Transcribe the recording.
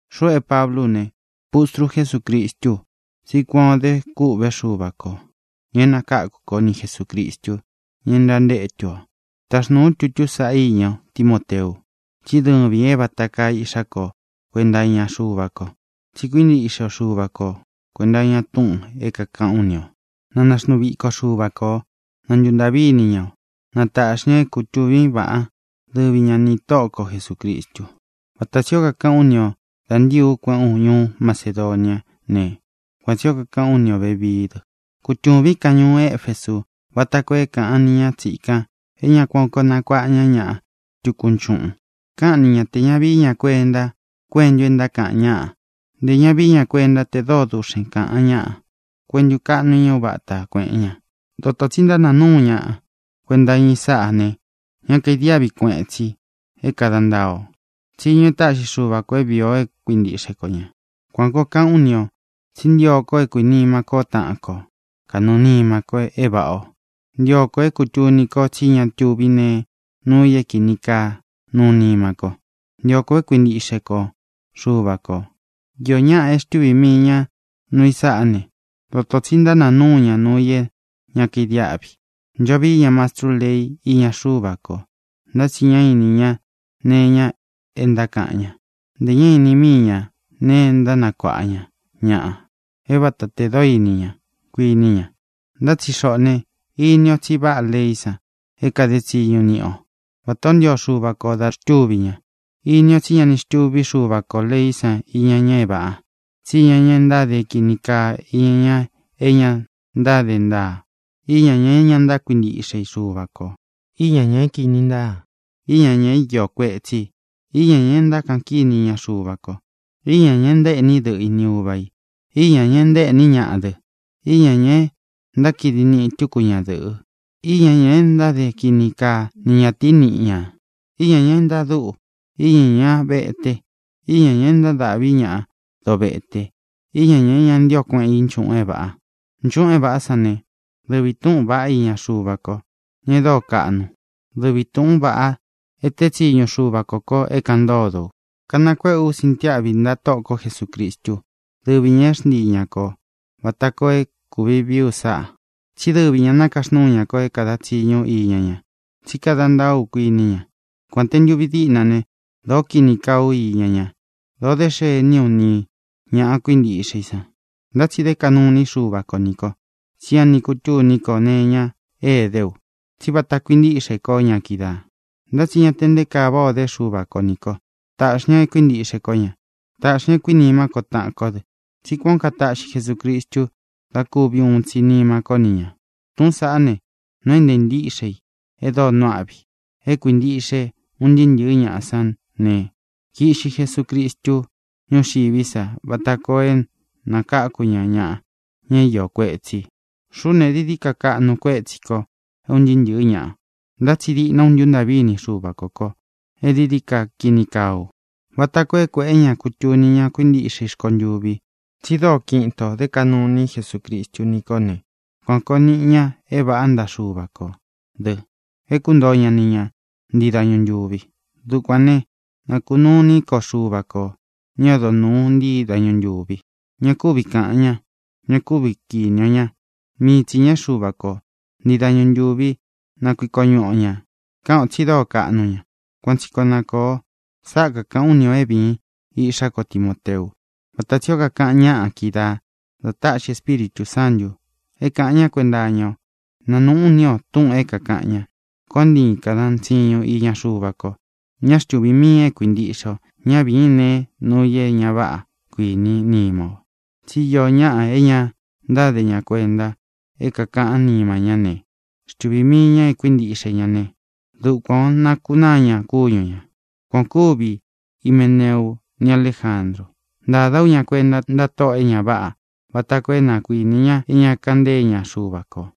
Xuꞌu é Pablú u ne, pustru Jesúcristú u, tsí kuan ō de kûꞌvé Xuva kō, ña e nakáku ko, ni Jesūcristu, ña é ntantétu ō. Taxnūu ú tutú saꞌa íña o, Timóteu. Tsí dɨvīn é vata kaa iꞌxá ko kuenta iña Xuva ko, tsi kuíntiꞌxe o Xuva ko kuēnta iña túꞌūn é kākaꞌán u ni ō. Na naxnuu viko Xuva ko ō. Na ntuntāꞌví ini ña o. Na tāꞌxi ña é kutūvín vaꞌan, dɨvi ña nī Tóꞌo ko Jesūcristu. Vata tsī ó kakaꞌán u ni ō da ntíi ú kueꞌén u ñuú Macedoniá ne, kuan tsī ó kakaꞌán u ni ō vevií dɨ: Kutūvín kan ñuú Efesu vata koo é kāꞌan ni ña tsíkān é ña ku kuan koo nakuaꞌa ña ñaꞌa tukú nchuꞌun. Káꞌan ni ña tē ña vií ña kuenta kuentu e ntákaꞌan ñáꞌa; ntē ña vií ña kuenta te dóo duꞌxen kāꞌan ñáꞌa kuentu kaꞌnu iña uváta kuēꞌen ña. Dotō tsi ntánāa núu ñaꞌa kuenta iña i sáꞌā ne, ña kaidiáꞌvi kueꞌen tsi é kāda ntaa o tsiñu e táꞌxi Xuva kō é vīi o é kuintiꞌxe ko ñā. Kuān ó kakaꞌán u ni ō tsí ntio ko é kuīnima kó taꞌan ko kanɨɨ̄ nima ko é vāꞌá o. Ntio ko é kūtuni ko tsí ña tuví nee nuu i é kīni kaa nuu nima ko. Ntio ko é kuintiꞌxe ntiꞌxe ko Xuva kō. Iō ñáꞌā é xtuvī mii ña núu i sáꞌa ne, dotō tsi ntánāa núu ña nuu i é ña kaidiáꞌvi. Ncho vií ña mastrú lei íña Xuva ko, ntá tsi ña ini ña nee iña é ntákaꞌan ña; ntē ñá īni míi ña nee e ntánakuaꞌa ña ñaꞌa é vāta te dóo ini ña, kuini ña. Ntá tsi xoꞌō ne, ini ó tsi váꞌā leí san é kade tsiñu niꞌi o, vata ō ntío Xuva kō da xtúvī ña. Ini ó tsi ña ni xtuví Xuva kō leí san iña ña é vāꞌa, tsí iña ña ntáde é kīni kaa; íña ñā é ña ntáde ntaa; íña ñā é ña ntákuintiꞌxe i Xuva kō; íña ñā é kīni ntáa; íña ñā é iō kuetsí i; íña ñā e ntákaꞌan kíni iña Xuva ko; íña ñā e ntaéꞌní dɨꞌɨ i ni uva ī; íña ñā e ntaéꞌní ñaꞌa dɨ; íña ñā e ntákidi niꞌi tuku ñadɨꞌɨ; íña ñā e ntáde kini kaa ni ñatīí niꞌi ñā; íña ñā é ntadúꞌu; íña ñā vete; íña ñā é ntadáꞌvi ñaꞌa dovete; íña ñā é ña ntío kueꞌen i nchuꞌun é vāꞌa. Nchuꞌun é vāꞌá san ne, dɨvi tūꞌún vaꞌa iña Xuva ko, ña e dóo kaꞌnu, dɨvi tūꞌún vaꞌa e tée tsiñu Xuva kō ko é kāꞌan ntódo u. Kanakuéꞌe ú sintiáꞌvi ntaꞌa Tóꞌo ko Jesūcristú, dɨvi ñā é xntíi ñā ko vata koo é kuvi vií u sáꞌā. Tsí dɨvi ñā nakaxnúu ña ko é kāda tsiñu ú iña ña, tsí kada ntaá u, kuiní ña. Kuān te ntuvi díꞌna ne, dōó kini kaꞌán u iña ña; dōo dé xení u nī ña kuíntiꞌxe i san, ntá tsi dé kaꞌnu iní Xuva ko nī ko, tsí ña ni kutûní ko nee iña é edé u, tsí vata kuintíꞌxē kó ña kídaā. Ntá tsi ña te nte kaa váꞌa o dé Xuva ko nī ko. Tāꞌxi ña é kuīntiꞌxe kó ña. Tāꞌxi ña é kuīnimá ko taꞌan kó dɨ, tsí kuān ó kataꞌxi Jesucristu da kúvi uun tsi nima ko ni ña. Tūꞌún saꞌá ne, nuu é ntāa ntíꞌxe ī e dóo nuu áꞌvi i é kuīntiꞌxe un ntɨɨ́ ntɨ̄ɨ́ ñaꞌa sán ne: Kīꞌxi Jesucristu ñúxiví sa vata koo é nākáku ña ñaꞌa, ña é iō kuetsí i. Xuꞌú ne, dií dií ka kaꞌnu kuétsī ko é un ntɨɨ́ ntɨ̄ɨ́ ñaꞌa. Ntá tsi diꞌna u ntúntaꞌví ini Xuva kō kó e dií dií ka kini kaa ú, vata koo é kuēꞌé ña kutuni ña kuíntiꞌxe i rkontuvi tsi dóo kiꞌin itō dé kaꞌnu ini Jesúcristu ní ko ne, kuan kōo niꞌi ña é vāꞌá ntaꞌa Xuva kō dɨ, é kuntoo ña ni ña ntii dañu ntūvi. Dukuān né, na kūnuu ini ko Xuva ko, ña é odo nūú ntii dañu ntūvi. Ña kuví ka ña. Ña kúvi kīni o ña. Mii tsi ñā é Xuva kō. Ntii dañu ntuvi na kuiko ñuꞌu o ñā. Káꞌan ō tsi dóo kaꞌnu ña. Kuan tsi koo na kōo. Sáꞌa kakāꞌán u ni ō é vīin, iꞌxá ko Timoteu, vata tsī ó kakaꞌan ñaꞌa kídaā, da táꞌxi Espíritū Sántū é kāꞌan ñá kuenta iña o. Nanūꞌún ini o túꞌūn é kākaꞌan ña. Koon ntiin kādan tsiñun iña Xuva ko. Ñá xtuvī miin e kuíntiꞌxe o. Ñá vīin nee nuu i é ñā váꞌa kuiní nima o. Tsí iō ñáꞌa é ña ntáde ña kuenta é kākaꞌán nima ñá ne, xtuvī mii ñá e kuíntiꞌxe ña ne, dukuān o nákunáa ña kúñu ñā. Kuan ō kúvi Himeneu ni Aléjandru. Ntādá u ña kuenta ntáꞌa tóꞌō e ña váꞌa vata koo é na kuinī ña é ña kaꞌan ntée ña Xuva kō.